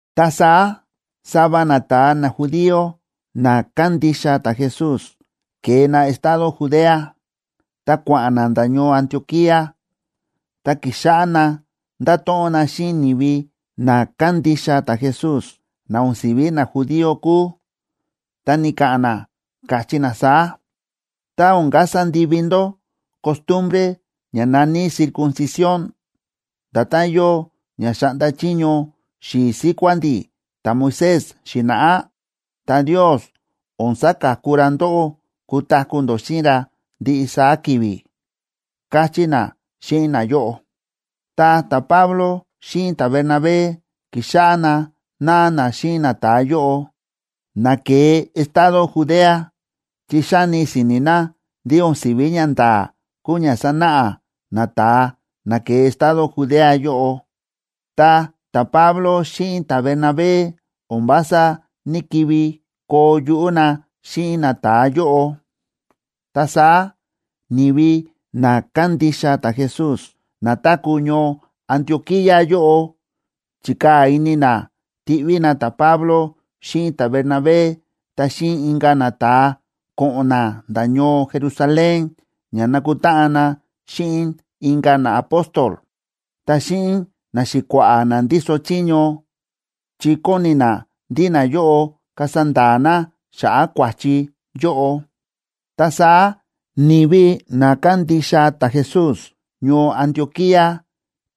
Ta saá sava nata̱a najudío na kándixa ta̱Jesús ke̱e na estado Judea, ta kua̱ꞌa̱n na nda̱ ñoo Antioquía, ta ki̱xáꞌá na ndáto̱ꞌon na xíꞌin ni̱vi na kándixa ta̱Jesús na o̱n si̱ví najudío kúu, ta ni̱ka̱ꞌa̱n na, káchí na saá: ―Tá o̱n kasa ndivi ndó costumbre ña na̱ní circuncisión, nda̱tán yóo ña xa̱ꞌnda chiño xi̱i̱ síkuá ndi̱ ta̱Moisés xi̱na̱ꞌá, ta Ndios o̱n saka̱ku ra ndóꞌó kutaku̱ ndó xíꞌin ra ndiꞌi saá ki̱vi̱ ―káchí na xíꞌin nayóꞌo. Ta ta̱Pablo xíꞌin ta̱Bernabé ki̱xáꞌá na náa na xíꞌin nata̱a yóꞌo na ke̱e estado Judea, chi xáni si̱ni̱ na ndí o̱n si̱ví ñanda̱a̱ kúu ña sánáꞌa nata̱a na ke̱e estado Judea yóꞌo. Ta ta̱Pablo xíꞌin ta̱Bernabé o̱n vása ní‑kivi koo yuꞌú na xíꞌin nata̱a yóꞌo. Ta saá ni̱vi na kándixa ta̱Jesús na táku̱ ñoo Antioquía yóꞌo chi̱kaa̱ ini na tiꞌví na ta̱Pablo xíꞌin ta̱Bernabé ta xíꞌin inka̱ nata̱a ko̱ꞌo̱n na nda̱ ñoo Jerusalén ña nakutáꞌan na xíꞌin inka̱ naapóstol, ta xíꞌin naxi̱kua̱ꞌa̱ na ndíso chiño, chi kóni na ndí nayóꞌo kasa nda̱a̱ na xa̱ꞌa̱ kua̱chi yóꞌo. Ta saá ni̱vi na kándixa ta̱Jesús ñoo Antioquía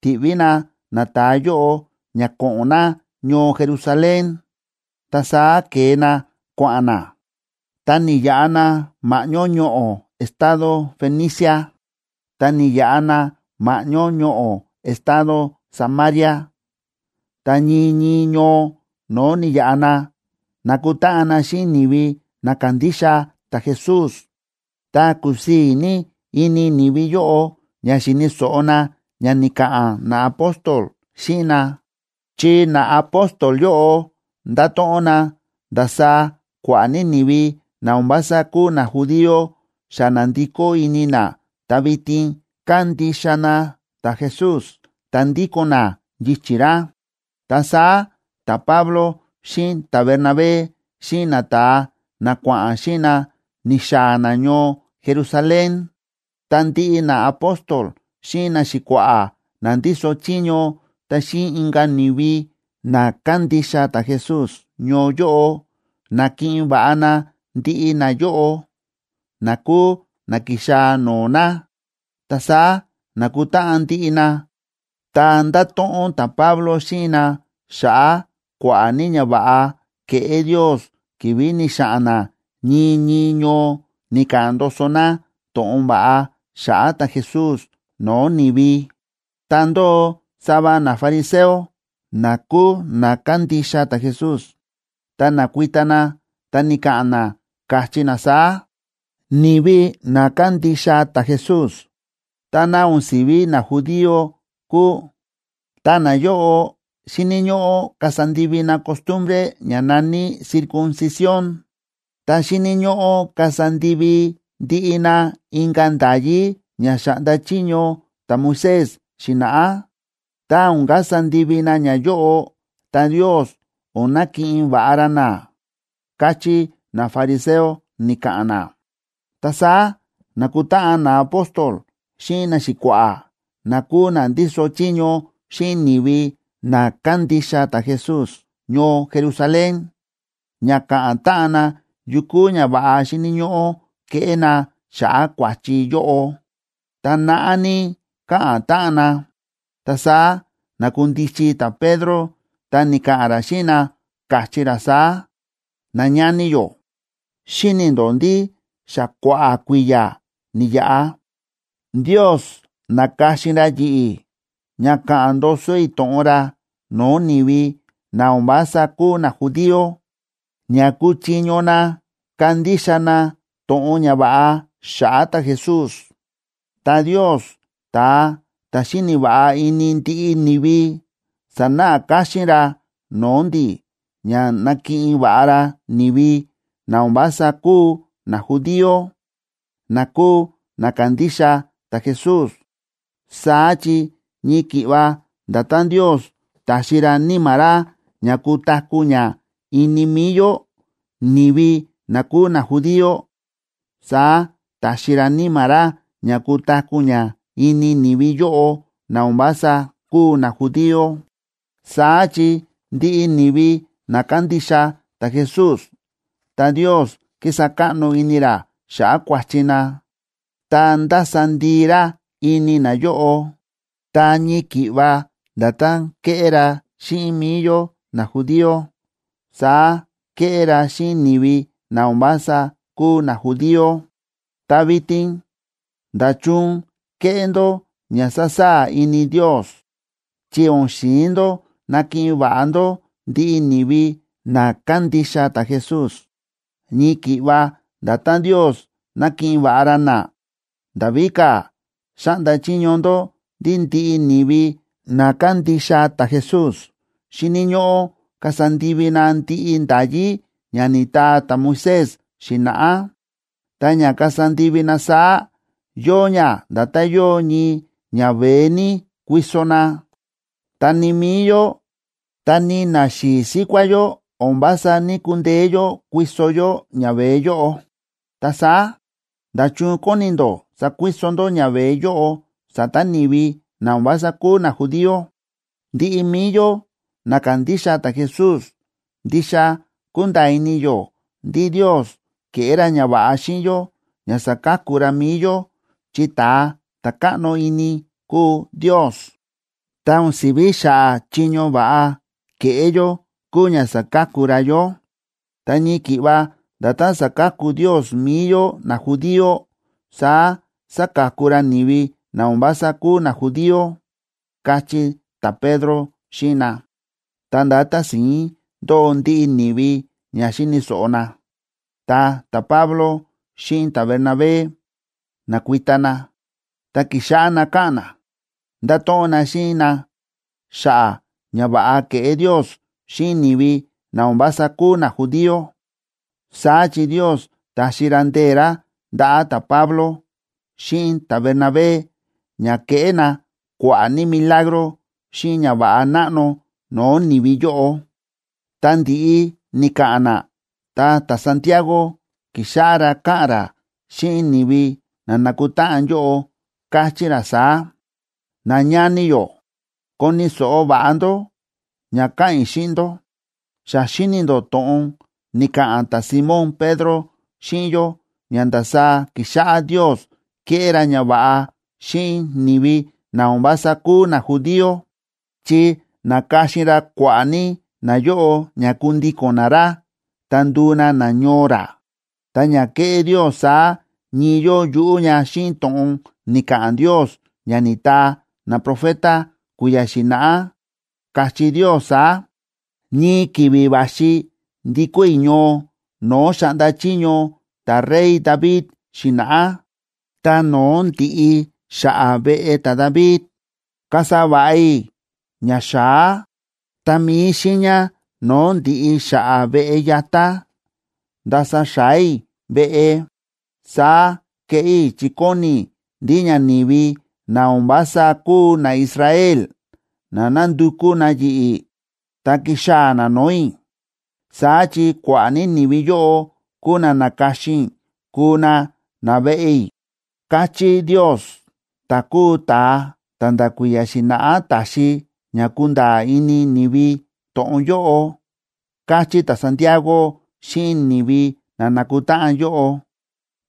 ti̱ꞌví na nata̱a yóꞌo ña ko̱ꞌo̱n na ñoo Jerusalén. Ta saá ke̱e na kua̱ꞌa̱n na, ta ni̱yaꞌa na ma̱ꞌñó ñoꞌo̱ estado Fenicia, ta ni̱yaꞌa na ma̱ꞌñó ñoꞌo̱ estado Samaria. Ta ñii ñii ñoo no̱o̱ ni̱yaꞌa na, na̱kutáꞌan na xíꞌin ni̱vi na kándixa ta̱Jesús. Ta kúsii̱ ní ini ni̱vi yóꞌo ña xíni̱ so̱ꞌo na ña ni̱ka̱ꞌa̱n naapóstol xíꞌin na, chi naapóstol yóꞌo nda̱to̱ꞌon na ndasaá kua̱ꞌa̱ ní ni̱vi na o̱n vása kúu najudío xa na̱ndikó ini na ta vitin kándixa na ta̱Jesús ta ndíko̱n na yichi̱ ra. Ta saá ta̱Pablo xíꞌin ta̱Bernabé xíꞌin nata̱a na kua̱ꞌa̱n xíꞌin na ni̱xaa̱ na ñoo Jerusalén, ta ndiꞌi naapóstol xíꞌin naxi̱kua̱ꞌa̱ na ndíso chiño ta xíꞌin inka̱ ni̱vi na kándixa ta̱Jesús ñoo yóꞌo, na̱kiꞌin va̱ꞌa na ndiꞌi nayóꞌo, na kúu na ki̱xaa̱ no̱o̱ na. Ta saá na̱kutáꞌan ndiꞌi na, ta nda̱to̱ꞌon ta̱Pablo xíꞌin na xa̱ꞌa̱ kua̱ꞌa̱ ní ñava̱ꞌa ke̱ꞌé Ndios ki̱vi̱ ni̱xa̱ꞌa̱n na ñii ñii ñoo ni̱ka̱ꞌa̱n ndoso na to̱ꞌon va̱ꞌa xa̱ꞌa̱ ta̱Jesús no̱o̱ ni̱vi. Ta ndóo sava nafariseo, na kúu na kándixa ta̱Jesús, ta na̱kuita na ta ni̱ka̱ꞌa̱n na, káchí na saá: ―Ni̱vi na kándixa ta̱Jesús, tá na o̱n si̱ví najudío kúu, ta nayóꞌo, xíni̱ ñóꞌó kasa ndivi na costumbre ña na̱ní circuncisión, ta xíni̱ ñóꞌó kasa ndivi ndiꞌi na inka̱ nda̱yí ña xa̱ꞌnda chiño ta̱Moisés xi̱na̱ꞌá. Tá o̱n kasa ndivi na ñayóꞌo, ta Ndios o̱n nakiꞌin va̱ꞌa ra na ―káchí nafariseo ni̱ka̱ꞌa̱n na. Ta saá na̱kutáꞌan naapóstol xíꞌin naxi̱kua̱ꞌa̱, na kúu na ndíso chiño xíꞌin ni̱vi na kándixa ta̱Jesús ñoo Jerusalén, ña ka̱ꞌa̱n táꞌan na yu kúu ñava̱ꞌa xíni̱ ñóꞌó keꞌé na xa̱ꞌa̱ kua̱chi yóꞌo. Ta naꞌá ní káꞌa̱n táꞌan na, ta saá na̱kundichi ta̱Pedro ta ni̱ka̱ꞌa̱n ra xíꞌin na, káchí ra saá: ―Nañani yó, xíni̱ ndó ndí xa kua̱ꞌa̱ kui̱ya̱ ni̱yaꞌa, Ndios na̱ka̱xin ra yi̱ꞌi̱ ña ka̱ꞌa̱n ndoso i̱ to̱ꞌon ra no̱o̱ ni̱vi na o̱n vása kúu najudío, ña kuchiño na kandixa na to̱ꞌon ñava̱ꞌa xa̱ꞌa̱ ta̱Jesús. Ta Ndios, ta̱a ta̱ xíni̱ va̱ꞌa ini ndiꞌi ni̱vi, sa̱náꞌa káxín ra no̱o̱ ndi̱ ña na̱kiꞌin va̱ꞌa ra ni̱vi na o̱n vása kúu najudío, na kúu na kándixa ta̱Jesús. Saá chi ñii ki̱ꞌva nda̱tán Ndios ta̱xi ra Níma̱ ra ña kutaku̱ ña ini mi̱i yó, ni̱vi na kúu najudío, saá ta̱xi ra Níma̱ ra ña kutaku̱ ña ini ni̱vi yóꞌo na o̱n vása kúu najudío. Saá chi ndiꞌi ni̱vi na kándixa ta̱Jesús, ta Ndios kísa káꞌno ini ra xa̱ꞌa̱ kua̱chi na ta ndása ndii ra ini nayóꞌo. Ta ñii ki̱ꞌva nda̱tán kéꞌé ra xíꞌin mi̱i yó najudío, saá kéꞌé ra xíꞌin ni̱vi na o̱n vása kúu najudío. Ta vitin, ¿nda̱chun kéꞌé ndó ña sasaa̱ ini Ndios?, chi o̱n xi̱in ndó nakiꞌin va̱ꞌa ndó ndiꞌi ni̱vi na kándixa ta̱Jesús, ñii ki̱ꞌva nda̱tán Ndios nákiꞌin va̱ꞌa ra na. Nda̱ víka̱, xáꞌnda chiño ndó ndí ndiꞌi ni̱vi na kándixa ta̱Jesús xíni̱ ñóꞌó kasa ndivi na ndiꞌi nda̱yí ña ni̱taa ta̱Moisés xi̱na̱ꞌá. Ta ña kasa ndivi na saá, yóo ña nda̱tán yóo ñii ñaveé ní kuiso na. Ta ni mi̱i yó, ta ni naxi̱i̱ síkuá yó, o̱n vása ní‑kundeé yó kuiso yó ñaveé yóꞌo. Ta saá, ¿nda̱chun kóni ndó sakuiso ndó ñaveé yóꞌo sa̱ta̱ ni̱vi na o̱n vása kúu najudío? Ndiꞌi mi̱i yó na kándixa ta̱Jesús, ndixa kúnda̱a̱ ini yó ndí Ndios ke̱ꞌé ra ñava̱ꞌa xíꞌin yó ña sa̱ka̱ku ra mi̱i yó chi ta̱a ta̱ káꞌno ini kúu Ndios, ta o̱n si̱ví xa̱ꞌa̱ chiño va̱ꞌa ke̱ꞌé yó kúu ña sa̱ka̱ku ra yó. Ta ñii ki̱ꞌva nda̱tán sáka̱ku Ndios mi̱i yó najudío, saá sáka̱ku ra ni̱vi na o̱n vása kúu najudío ―káchí ta̱Pedro xíꞌin na. Ta ndá tási̱ín ndóo ndiꞌi ni̱vi ña xíni̱ so̱ꞌo na. Ta ta̱Pablo xíꞌin ta̱Bernabé na̱kuita na, ta ki̱xáꞌá na káꞌa̱n na, nda̱to̱ꞌon na xíꞌin na xa̱ꞌa̱ ñava̱ꞌa ke̱ꞌé Ndios xíꞌin ni̱vi na o̱n vása kúu najudío. Saá chi Ndios ta̱xi ra ndee̱ ra ndaꞌa̱ ta̱Pablo xíꞌin ta̱Bernabé ña ke̱ꞌé na kua̱ꞌa̱ ní milagro xíꞌin ñava̱ꞌa náꞌno no̱o̱ ni̱vi yóꞌo. Tá ndi̱ꞌi ni̱ka̱ꞌa̱n na, ta ta̱Santiagoa ki̱xáꞌá ra káꞌa̱n ra xíꞌin ni̱vi na nákutáꞌan yóꞌo, ta káchí ra saá: ―Nañani yó, ¡koni̱ so̱ꞌo va̱ꞌa ndó ña ka̱ꞌa̱n i̱ xíꞌin ndó! Xa xi̱ni̱ ndó to̱ꞌon ni̱ka̱ꞌa̱n ta̱Simón Pedro xíꞌin yó ña ndasaá ki̱xáꞌá Ndios kéꞌé ra ñava̱ꞌa xíꞌin ni̱vi na o̱n vása kúu najudío, chi na̱ka̱xin ra kua̱ꞌa̱ ní nayóꞌo ña kundíko̱n na ra ta nduu na nañoo ra. Ta ña ke̱ꞌé Ndios saá, ñii yóo yuꞌú ña xíꞌin to̱ꞌon ni̱ka̱ꞌa̱n Ndios ña ni̱taa naprofeta kui̱ya̱ xi̱na̱ꞌá, káchí Ndios saá: Ñii ki̱vi̱ va̱xi ndikó i̱ ñoo no̱o̱ xa̱ꞌnda chiño ta̱rey David xi̱na̱ꞌá, ta no̱o̱ ndi̱ꞌi xa̱ꞌa̱ veꞌe ta̱David, kasa va̱ꞌa i̱ ña xa̱á, ta mi̱i xiiña no̱o̱ ndi̱ꞌi xa̱ꞌa̱ veꞌe yatá, ndasa xa̱á i̱ veꞌe. Saá keꞌé i̱ chi kóni i̱ ndí ña ni̱vi na o̱n vása kúu naIsrael ná nandukú na yi̱ꞌi̱ ta kixaa̱ na no̱o̱ i̱. Saá chi kua̱ꞌa̱ ní ni̱vi yóꞌo kúu na na̱ka̱xin i̱ kuu na naveꞌe i̱, káchí Ndios, ta̱ kúu ta̱a ta̱ nda̱ kui̱ya̱ xi̱na̱ꞌá ta̱xi ña kunda̱a̱ ini ni̱vi to̱ꞌon yóꞌo ―káchí ta̱Santiago xíꞌin ni̱vi na nákutáꞌan yóꞌo.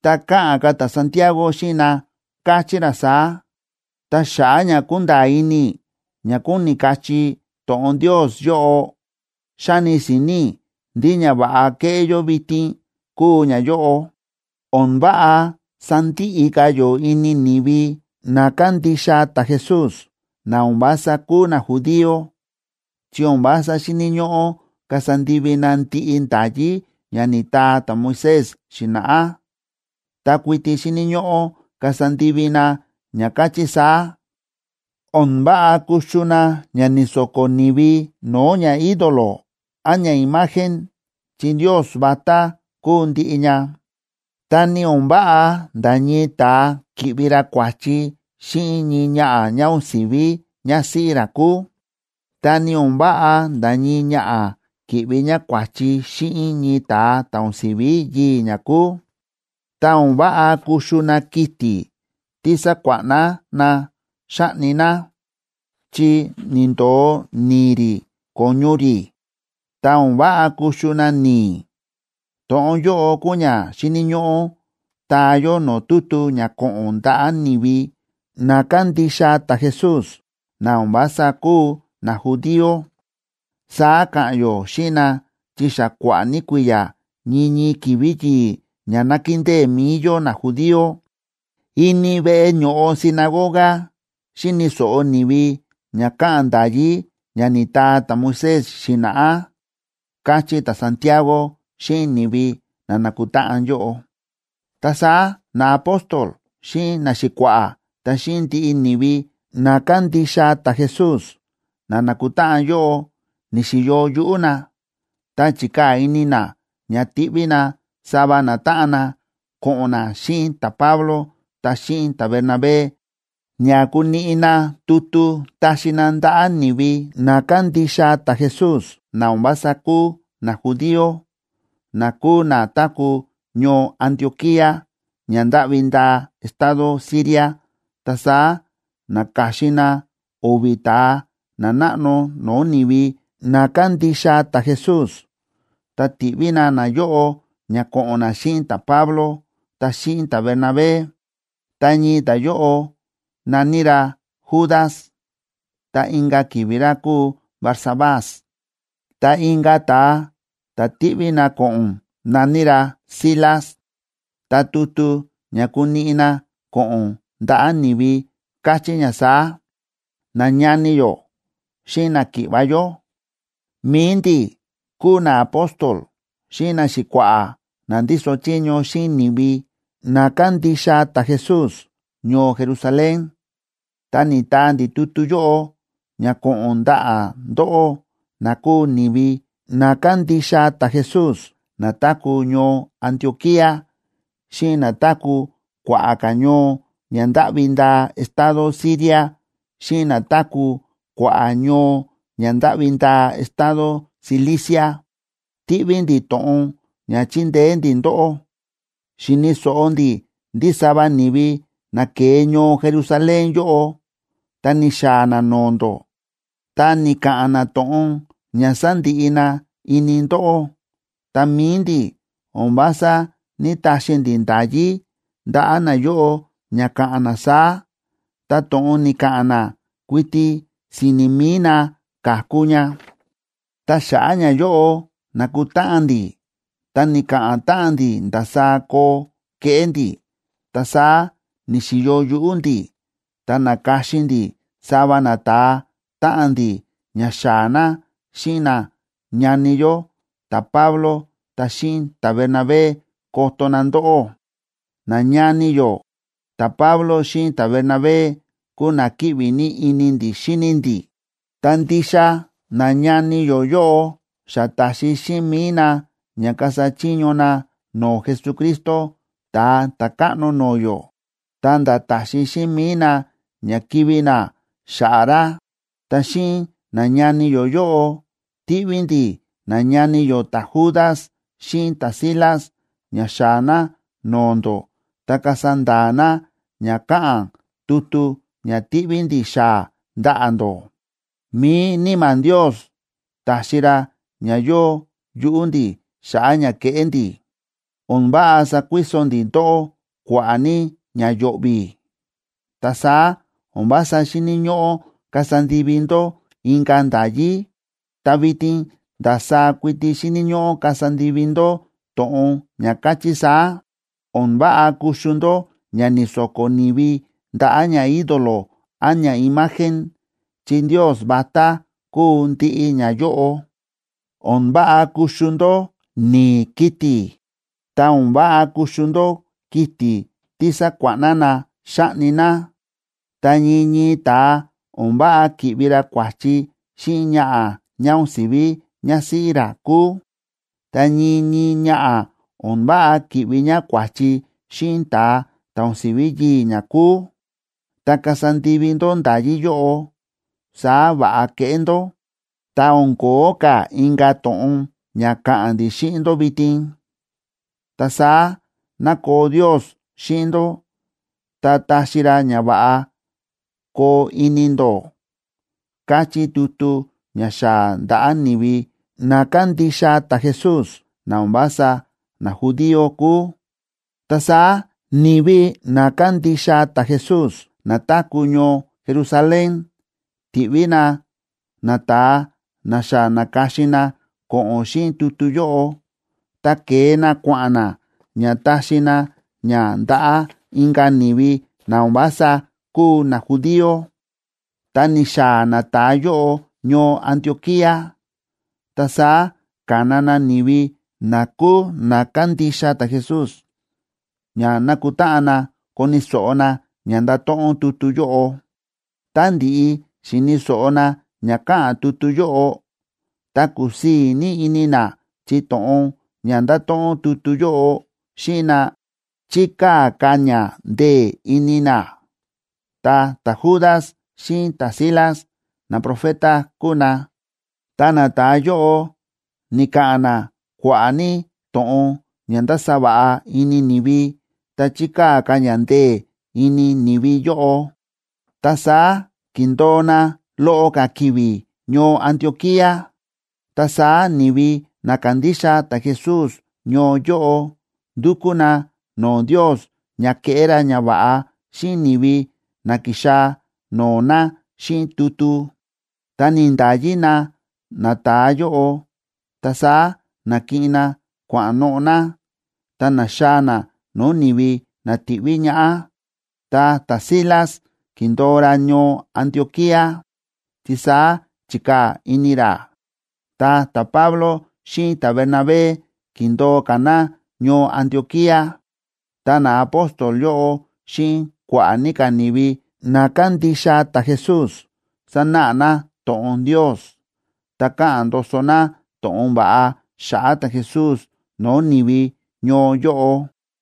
Ta káꞌa̱n ka̱ ta̱Santiago xíꞌin na, káchí ra saá: ―Ta xa̱ꞌa̱ ña kúnda̱a̱ ini i̱ ña kóni kachí to̱ꞌon Ndios yóꞌo, xáni si̱ni̱ i̱ ndí ñava̱ꞌa keꞌé yó vitin kúu ñayóꞌo: O̱n váꞌa sandiꞌi ka̱ yó ini ni̱vi na kándixa ta̱Jesús, na o̱n vása kúu najudío, chi o̱n vása xíni̱ ñóꞌó kasa ndivi na ndiꞌi nda̱yí na ni̱taa ta̱Moisés xi̱na̱ꞌá. Ta kuiti xíni̱ ñóꞌó kasa ndivi na ña káchí saá: O̱n váꞌa kuxu na ña ni̱so̱ko̱ ni̱vi no̱o̱ ñaídolo án ñaimagen, chi ndios vatá kúu ndiꞌi ña. Ta ni o̱n váꞌa nda̱ ñii ta̱a ki̱ꞌvi ra kua̱chi xíꞌin ñii ñaꞌa̱ ñá o̱n si̱ví ñásíꞌí ra kúu, ta ni o̱n váꞌa nda̱ ñii ñaꞌa̱ ki̱ꞌvi ñá kua̱chi xíꞌin ñii ta̱a ta̱ o̱n si̱ví yii̱ ñá kúu. Ta o̱n váꞌa kuxu na kiti̱ tí sa̱kuáꞌna na xa̱ꞌni na, chi ni̱ndo̱o ni̱i̱ rí ko̱ñu rí, ta o̱n váꞌa kuxu na ni̱i̱. To̱ꞌon yóꞌo kúu ña xíni̱ ñóꞌó taa yó no̱o̱ tutu ña ko̱ꞌo̱n ndaꞌa̱ ni̱vi na kándixa ta̱Jesús na o̱n vása kúu najudío. Saá ka̱ꞌa̱n yó xíꞌin na, chi xa kua̱ꞌa̱ ní kui̱ya̱ ñii ñii ki̱vi̱ yi̱i̱ ña nákindée mi̱i yó najudío, ini veꞌe ño̱ꞌo sinagoga xíni̱ so̱ꞌo ni̱vi ña káꞌa̱n nda̱yí ña ni̱taa ta̱Moisés xi̱na̱ꞌá ―káchí ta̱Santiago xíꞌin ni̱vi na na̱kutáꞌan yóꞌo. Ta saá naapóstol xíꞌin naxi̱kua̱ꞌa̱ ta xíꞌin ndiꞌi ni̱vi na kándixa ta̱Jesús na nákutáꞌan yóꞌo ni̱xi̱yo yuꞌú na, ta chi̱kaa̱ ini na ña ti̱ꞌví na sava natáꞌan na ko̱ꞌo̱n na xíꞌin ta̱Pablo ta xíꞌin ta̱Bernabé ña kuniꞌi na tutu taxi na ndaꞌa̱ ni̱vi na kándixa ta̱Jesús na o̱n vása kúu najudío, na kúu na táku̱ ñoo Antioquía ña ndáꞌvi ndaa estado Siria. Ta saá na̱ka̱xin na o̱vi̱ ta̱a nanáꞌno no̱o̱ ni̱vi na kándixa ta̱Jesús, ta ti̱ꞌví na nayóꞌo ña ko̱ꞌo̱n na xíꞌin ta̱Pablo ta xíꞌin ta̱Bernabé. Ta ñii ta̱a yóꞌo na̱ní ra Judas, ta inka̱ ki̱vi̱ ra kúu Barsabás. Ta inka̱ ta̱a ta̱ ti̱ꞌví na ko̱ꞌo̱n na̱ní ra Silas. Ta tutu ña kuniꞌi na ko̱ꞌo̱n ndaꞌa̱ ni̱vi káchí ña saá: “Nañani yó xíꞌin náki̱ꞌva̱ yó, mi̱i ndi̱ kúu naapóstol xíꞌin naxi̱kua̱ꞌa̱ na ndíso chiño xíꞌin ni̱vi na kándixa ta̱Jesús ñoo Jerusalén. Ta ni̱taa ndi̱ tutu yóꞌo ña ko̱ꞌo̱n ndaꞌa̱ ndóꞌó, na kúu ni̱vi na kándixa ta̱Jesús na táku̱ ñoo Antioquía, xíꞌin na táku̱ kua̱ꞌa̱ ka̱ ñoo ña ndáꞌvi ndaa estado Siria, xíꞌin na táku̱ kua̱ꞌa̱ ñoo ña ndáꞌvi ndaa estado Cilicia. ¡Tíꞌví ndi̱ to̱ꞌon ña chindeé ndi̱ ndóꞌó! Xi̱ni̱ so̱ꞌo ndi̱ ndí sava ni̱vi na ke̱e ñoo Jerusalén yóꞌo, ta ni̱xaa̱ na no̱o̱ ndó ta ni̱ka̱ꞌa̱n na to̱ꞌon ña sa̱ndiꞌi na ini ndóꞌó. Ta mi̱i ndi̱ o̱n vása ní‑taxi ndi̱ nda̱yí ndaꞌa̱ nayóꞌo ña ka̱ꞌa̱n na saá, ta to̱ꞌon ni̱ka̱ꞌa̱n na kuiti si̱ni̱ mi̱i na ka̱ku ña. Ta xa̱ꞌa̱ ñayóꞌo na̱kutáꞌan ndi̱ ta ni̱ka̱ꞌa̱n táꞌan ndi̱ ndasaá koo keꞌé ndi̱. Ta saá ni̱xi̱yo yuꞌú ndi̱, ta na̱ka̱xin ndi̱ sava nata̱a táꞌan ndi̱ ña xaa̱ na xíꞌin nañani yó ta̱Pablo ta xíꞌin ta̱Bernabé koto na ndóꞌó. Nañani yó ta̱Pablo xíꞌin ta̱Bernabé kúu na kíꞌvi ní ini ndi̱ xíni ndi̱, ta ndixa nañani yó yóꞌo xa ta̱xi xíꞌin mi̱i na ña kasa chiño na no̱o̱ Jesucristo, Ta̱a Ta̱káꞌno no̱o̱ yó, ta̱nda̱ táxi xíꞌin mi̱i na ña kivi̱ na xa̱ꞌa̱ ra. Ta xíꞌin nañani yó yóꞌo ti̱ꞌví ndi̱ nañani yó ta̱Judas xíꞌin ta̱Silas ña xaa̱ na no̱o̱ ndó ta kasa nda̱a̱ na ña káꞌa̱n tutu ña tíꞌví ndi̱ xaa̱ ndaꞌa̱ ndó. Mi̱i Níma̱ Ndios ta̱xi ra ña yóo yuꞌú ndi̱ xa̱ꞌa̱ ña keꞌé ndi̱. O̱n váꞌa sakuiso ndi̱ ndóꞌó kua̱ꞌa̱ ní ña yo̱ꞌvi̱, ta saá o̱n vása xíni̱ ñóꞌó kasa ndivi ndó inka̱ nda̱yí, ta vitin ndasaá kuiti xíni̱ ñóꞌó kasa ndivi ndó to̱ꞌon ña káchí saá: O̱n váꞌa kuxu ndó ña ni̱so̱ko̱ ni̱vi ndaꞌa̱ ñaídolo án ñaimagen, chi ndios vatá kúu ndiꞌi ñayóꞌo. O̱n váꞌa kuxu ndó ni̱i̱ kiti̱, ta o̱n váꞌa kuxu ndó kiti̱ tí sa̱kuáꞌna na xa̱ꞌni na. Ta ñii ñii ta̱a, o̱n váꞌa ki̱ꞌvi ra kua̱chi xíꞌin ñaꞌa̱ ñá o̱n si̱ví ñásíꞌí ra kúu. Ta ñii ñii ñaꞌa̱, o̱n váꞌa ki̱ꞌvi ñá kua̱chi xíꞌin ta̱a ta̱ o̱n si̱ví yii̱ ñá kúu. Tá kasa ndivi ndó nda̱yí yóꞌo, saá va̱ꞌa keꞌé ndó, ta o̱n ko̱ó ka̱ inka̱ to̱ꞌon ña ka̱ꞌa̱n ndi̱ xíꞌin ndó vitin. Ta saá ná koo Ndios xíꞌin ndó ta taxi ra ña va̱ꞌa koo ini ndó”, káchí tutu ña xaa̱ ndaꞌa̱ ni̱vi na kándixa ta̱Jesús, na o̱n vása najudío kúu. Ta saá ni̱vi na kándixa ta̱Jesús na táku̱ ñoo Jerusalén ti̱ꞌví na nata̱a na xa na̱ka̱xin na ko̱ꞌo̱n xíꞌin tutu yóꞌo, ta ke̱e na kua̱ꞌa̱n na, ña taxi na ña ndaꞌa̱ inka̱ ni̱vi na o̱n vása kúu najudío. Tá ni̱xaa̱ nata̱a yóꞌo ñoo Antioquía, ta saá ka̱na na ni̱vi na kúu na kándixa ta̱Jesús ña nakutáꞌan na koni̱ so̱ꞌo na ña ndáto̱ꞌon tutu yóꞌo. Tá ndi̱ꞌi xi̱ni̱ so̱ꞌo na ña káꞌa̱n tutu yóꞌo, ta kúsii̱ ní ini na chi to̱ꞌon ña nda̱to̱ꞌon tutu yóꞌo xíꞌin na, chi̱kaa̱ ka̱ ña ndee̱ ini na. Ta ta̱Judas xíꞌin ta̱Silas, naprofeta kúu na, ta nata̱a yóꞌo ni̱ka̱ꞌa̱n na kua̱ꞌa̱ ní to̱ꞌon ña nda̱sa va̱ꞌa ini ni̱vi ta chi̱kaa̱ ka̱ ña ndee̱ ini ni̱vi yóꞌo. Ta saá ki̱ndo̱o na loꞌo ka̱ ki̱vi̱ ñoo Antioquía, ta saá ni̱vi na kándixa ta̱Jesús ñoo yóꞌo ndu̱kú na no̱o̱ Ndios ña keꞌé ra ñava̱ꞌa xíꞌin ni̱vi na ki̱xaa̱ no̱o̱ na xíꞌin tutu, ta ni̱nda̱yi na nata̱a yóꞌo. Ta saá na̱kiꞌin na kua̱ꞌa̱n noꞌo̱ na, ta na̱xaa̱ na no̱o̱ ni̱vi na ti̱ꞌví ñaꞌá. Ta ta̱Silas ki̱ndo̱o ra ñoo Antioquía chi saá chi̱kaa̱ ini ra. Ta ta̱Pablo xíꞌin ta̱Bernabé ki̱ndo̱o ka̱ na ñoo Antioquía. Ta naapóstol yóꞌo xíꞌin kua̱ꞌa̱ ní ka̱ ni̱vi na kándixa ta̱Jesús, sánáꞌa na to̱ꞌon Ndios, ta káꞌa̱n ndoso na to̱ꞌon va̱ꞌa xa̱ꞌa̱ ta̱Jesús no̱o̱ ni̱vi ñoo yóꞌo.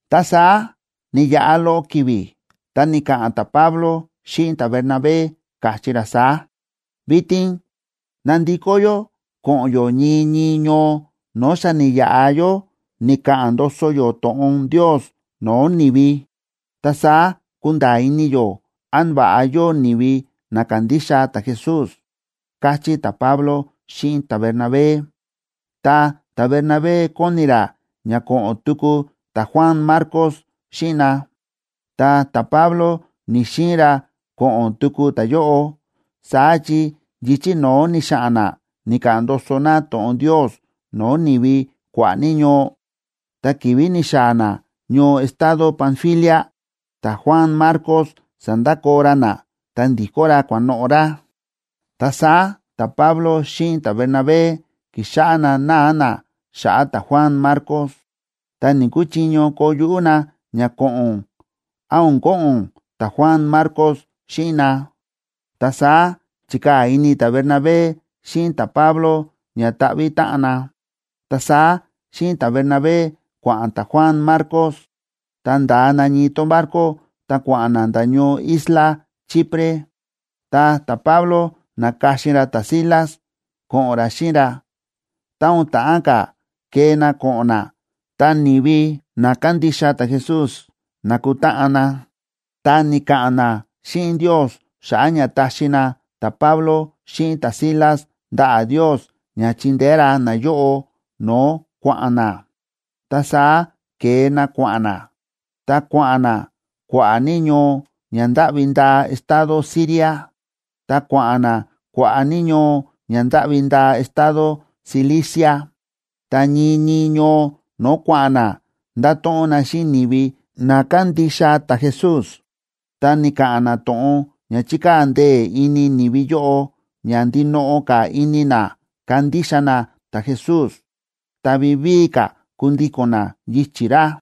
Ta saá ni̱yaꞌa loꞌo ki̱vi̱, ta ni̱ka̱ꞌa̱n ta̱Pablo xíꞌin ta̱Bernabé, káchí ra saá: ―Vitin ná ndikó yó ko̱ꞌo̱n yó ñii ñii ñoo no̱o̱ xa ni̱yaꞌa yó ni̱ka̱ꞌa̱n ndoso yó to̱ꞌon Ndios no̱o̱ ni̱vi. Ta saá kunda̱a̱ ini yó án va̱ꞌa yóo ni̱vi na kándixa ta̱Jesús ―káchí ta̱Pablo xíꞌin ta̱Bernabé. Ta ta̱Bernabé kóni ra ña ko̱ꞌo̱n tuku ta̱Juan Marcos xíꞌin na. Ta ta̱Pablo ni̱‑xiin ra ko̱ꞌo̱n tuku ta̱yóꞌo, saá chi yichi̱ no̱ó ni̱xa̱ꞌa̱n na ni̱ka̱ꞌa̱n ndoso na to̱ꞌon Ndios no̱o̱ ni̱vi kua̱ꞌa̱ ní ñoo, ta ki̱vi̱ ni̱xaa̱ na ñoo estado Panfilia, ta̱Juan Marcos sa̱ndakoo ra na ta ndi̱kó ra kua̱noꞌo̱ ra. Ta saá ta̱Pablo xíꞌin ta̱Bernabé ki̱xáꞌá na náa na xa̱ꞌa̱ ta̱Juan Marcos, ta ni̱‑kuchiño koo yuꞌú na ña ko̱ꞌo̱n án o̱n ko̱ꞌo̱n ta̱Juan Marcos xíꞌin na. Ta saá chi̱kaa̱ ini ta̱Bernabé xíꞌin ta̱Pablo ña ta̱ꞌvi̱ táꞌan na. Ta saá xíꞌin ta̱Bernabé kua̱ꞌa̱n ta̱Juan Marcos. Ta nda̱a na ñii tón barco ta kua̱ꞌa̱n na nda̱ ñoo isla Chipre. Ta ta̱Pablo na̱ka̱xin ra ta̱Silas ko̱ꞌo̱n ra xíꞌin ra. Tá o̱n ta̱ꞌán ka̱ kee na ko̱ꞌo̱n na, ta ni̱vi na kándixa ta̱Jesús na̱kutáꞌan na, ta ni̱ka̱ꞌa̱n na xíꞌin Ndios xa̱ꞌa̱ ña taxi na ta̱Pablo xíꞌin ta̱Silas ndaꞌa̱ Ndios ña chindeé ra nayóꞌo no̱o̱ kua̱ꞌa̱n na. Ta saá ke̱e na kua̱ꞌa̱n na, ta kua̱ꞌa̱n na kua̱ꞌa̱ ní ñoo ña ndáꞌvi ndaa estado Siria, ta kua̱ꞌa̱n na kua̱ꞌa̱ ní ñoo ña ndáꞌvi ndaa estado Cilicia. Ta ñii ñii ñoo no̱o̱ kua̱ꞌa̱n na, nda̱to̱ꞌon na xíꞌin ni̱vi na kándixa ta̱Jesús, ta ni̱ka̱ꞌa̱n na to̱ꞌon ña chi̱kaa̱ ndee̱ ini ni̱vi yóꞌo ña ndinoꞌo ka̱ ini na kandixa na ta̱Jesús, ta vivíi ka̱ kundíko̱n na yichi̱ ra.